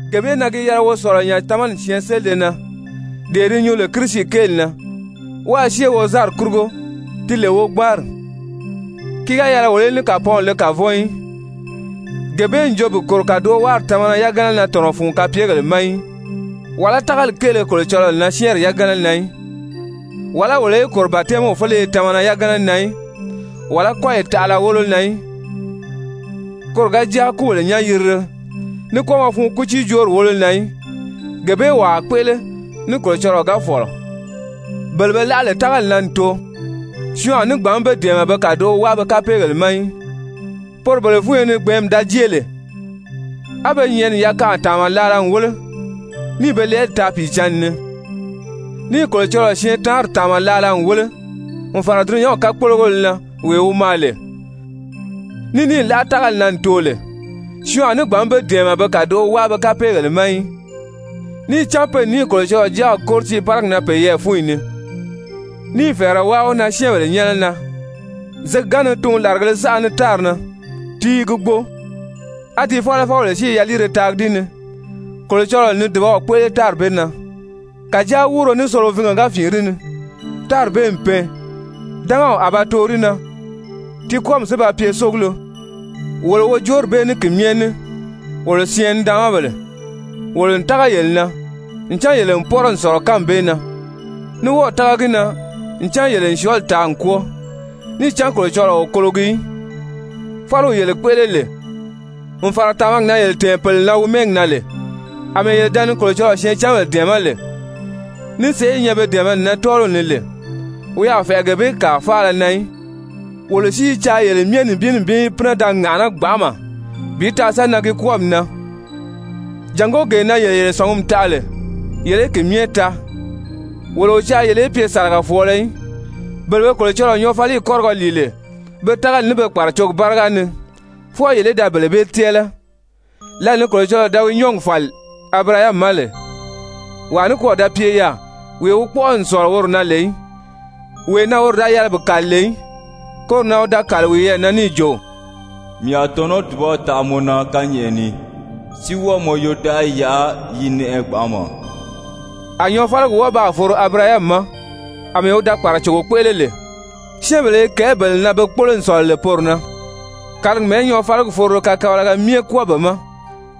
Gee bee na gi yɛlɛ wo sɔ̀lɔ nya tamani syɛɛnselide na, dee di nyuu lè Kirisi kéeli na, wáā syée wozanri kurugo ti lè wogbanri, ki ga yɛlɛ wolo í ní kàpɔɔnw le kavɔn í, gee bee n jo bi kòro kàdowaari tamana yagana na tɔ̀nɔ fun kapyegèle ma í, wàlá tágali kéele Kolocɔlɔɔ na syɛ́ɛnri yagana na í, wàlá wolo í kòro batɛmiw féleye tamana yagana na í, wàlá kɔ́yi taʔala wólo na í, koro ga jáa kúbèle nyán-yirile, ní kwɔ́ɔmɔ fun kútiijoori wólo na í. Gee bee wo a kpéʔele ní Kolocɔlɔɔ ga fɔ̀lɔ. Bele be láʔa lè tágali na n too, syɔɔn a ní gbǎn be dɛ̀ɛmɛ be kàdoʔo wáa be kapeegèle ma í, poro bele fúnyo ni gbɛ̀ɛ́nmi da jée lè á be nyɛ̀ʔɛni yakanʔa tàanma laala n wéle, níì be lɛɛli taa Pìicǎnni ni, níì Kolocɔlɔɔ syɛɛntaanri tàanma laala n wéle n fàra dulunyanw kakpologéle na wee wi maa lè, ní níì láʔa tágali na n too lè, syɔɔn a ní gbǎn be dɛ̀ɛmɛ be kàdoʔo wáa be kapeegèle ma í. Níì cán pe n níì Kolocɔlɔɔ Jáaw kóri tiiparigi na peyɛɛ fúnyi ni, níì fɛ̀ɛrɛ wáa wi na syɛ́ɛnbèle nyɛ́nɛ na. Zěgi ga ni tuun làrigēle saʔa ni tári na ti i gi gbo, á di fálafɔbèle si i yaliire taagi di ni, Kolocɔlɔɔ n ni dùbaw kpéʔele tári bee na. Kàjáa wúuro ní solovinge ga fìin di ni, tári bee n pɛɛn, dángaw a ba too di na, ti kwɔ́ɔmi si ba pye sógulo. Wolo wojoori bee ní ki myɛ ní, wolo syɛɛn-nidaanmabèle, wolo n tága yele na ncan yele n pɔ́rɔ n sɔ̀lɔ kánmi bee na, ní wɔ́ɔ̀ tága gi na ncan yele n syɔɔli taa n kwɔ́ɔ. Níì cán Kolocɔlɔɔ o kologi í, fáliw yele kpéʔele lè n fàra tàmagi na yele tɛ̀ɛn pèle na wi mɛ́ɛgi na lè, àmɛɛ yele da ni Kolocɔlɔɔ syɛɛncanbèle dɛ̀ɛmɛ́ lè ní sèʔé i nyɛ be dɛ̀ɛmɛni na tɔ́ɔliw ni lè, wi a fɛ̀ʔɛ gee bee kàa faala na í. Wolo si i caa yele myɛ nibin nibin í pínɛ da ŋàʔaná gbanʔama bi taa sa nan ki kwɔ́ɔmi na, jàngó gee na yele yele sɔ̀ngumi taʔa lè, yele í ki myɛ taa. Wolo o caa yele í pye sàlagafɔɔlɔ í, bele be Kolocɔlɔɔ nyɔɔfaliyi kɔ́rigɔ lìi lè be tágali ní be kpàracogi báriga ni fwɔɔ yele í da bele bee tɛ́ɛlɛ. Lǎli ni Kolocɔlɔɔ da wi nyɔ́ɔgi fàli Abirahami ma lè, wàa nikwɔɔ da pye yaà wee wi kpɔ́ʔɔ n sɔ̀lɔ woro na lè í, wee na woro da yɛlɛ bi kàli lè í, koro na wi da kàli wiyɛɛ na, níì jo: «Mii a tɔ̀nɔ́ dùbaw taʔa mɔ na kányɛʔɛ ni, si wɔ́ɔ mɔ yodaʔayi yaʔa yi nɛʔɛ gbanʔama.» A nyɔɔfaligi wɔ́ɔ baa foro Abirahami ma àmɛɛ wi da kpàracogo kpéʔele lè. Syɛ́ɛnbèle i kɛ̀ɛ́ bele na be kpólo n sɔ̀lɔ lè poro na, kàligi mɛ̀ɛ́ nyɔɔfaligi forolo kakabalaga myɛ kwɔ́ɔ be ma.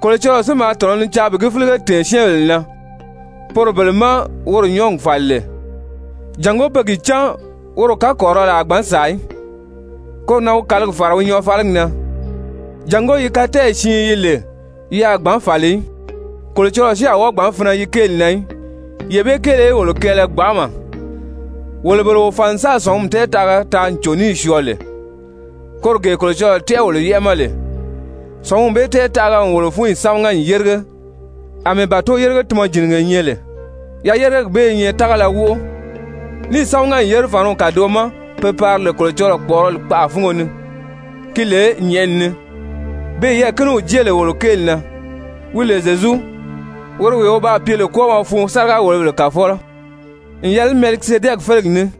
Kolocɔlɔɔ si maa tɔ̀nɔ ni caa bi gi fílige tɛ̀ɛn syɛ́ɛnbèle na poro bele má woro nyɔ́ɔgi fàli lè, jàngó pe gi cán woro kakɔrirɔli a gbǎn sàa í, koro na wi kàligi fàra wi nyɔɔfaligi na, jàngó yi katɛɛyi siin yi lè yi a gbǎn fàli í, Kolocɔlɔɔ si a wɔ́ɔ gbǎn finɛ yi kéeli na í, yee bee kéele í wolo kɛɛlɛ gbanʔama, wolo bele wo fàn n sáà sɔ̀ngumi tɛɛtaʔaga taa n cò níì syɔɔ lè, koro gee Kolocɔlɔɔ tɛ́ʔɛ wolo yɛ́ʔɛ ma lè. Sɔ̀ngumi bee tɛɛtaʔaga n wolo fúnyi sámaga n yérige àmɛɛ bàto-yérige-tunmɔjinige nyɛ lè. Yayerigegi bee i nyɛ tágala wóʔo, níì sámaga n yére fàniw kàdoʔo ma pe pari lè Kolocɔlɔɔ kpɔ̀ʔɔrɔli kpaʔa fúngo ni, ki lè nyɛ̀ʔɛni ni, beè yɛɛ̀kiniw jée lè wolo kéeli na, wi lè Zyezu, woro wee wi baa pye lè kwɔ́ɔmɔ fun sáriga-wòlobèle kàfɔlɔ n yɛlɛ ní Mɛlikizedɛki félegi ní.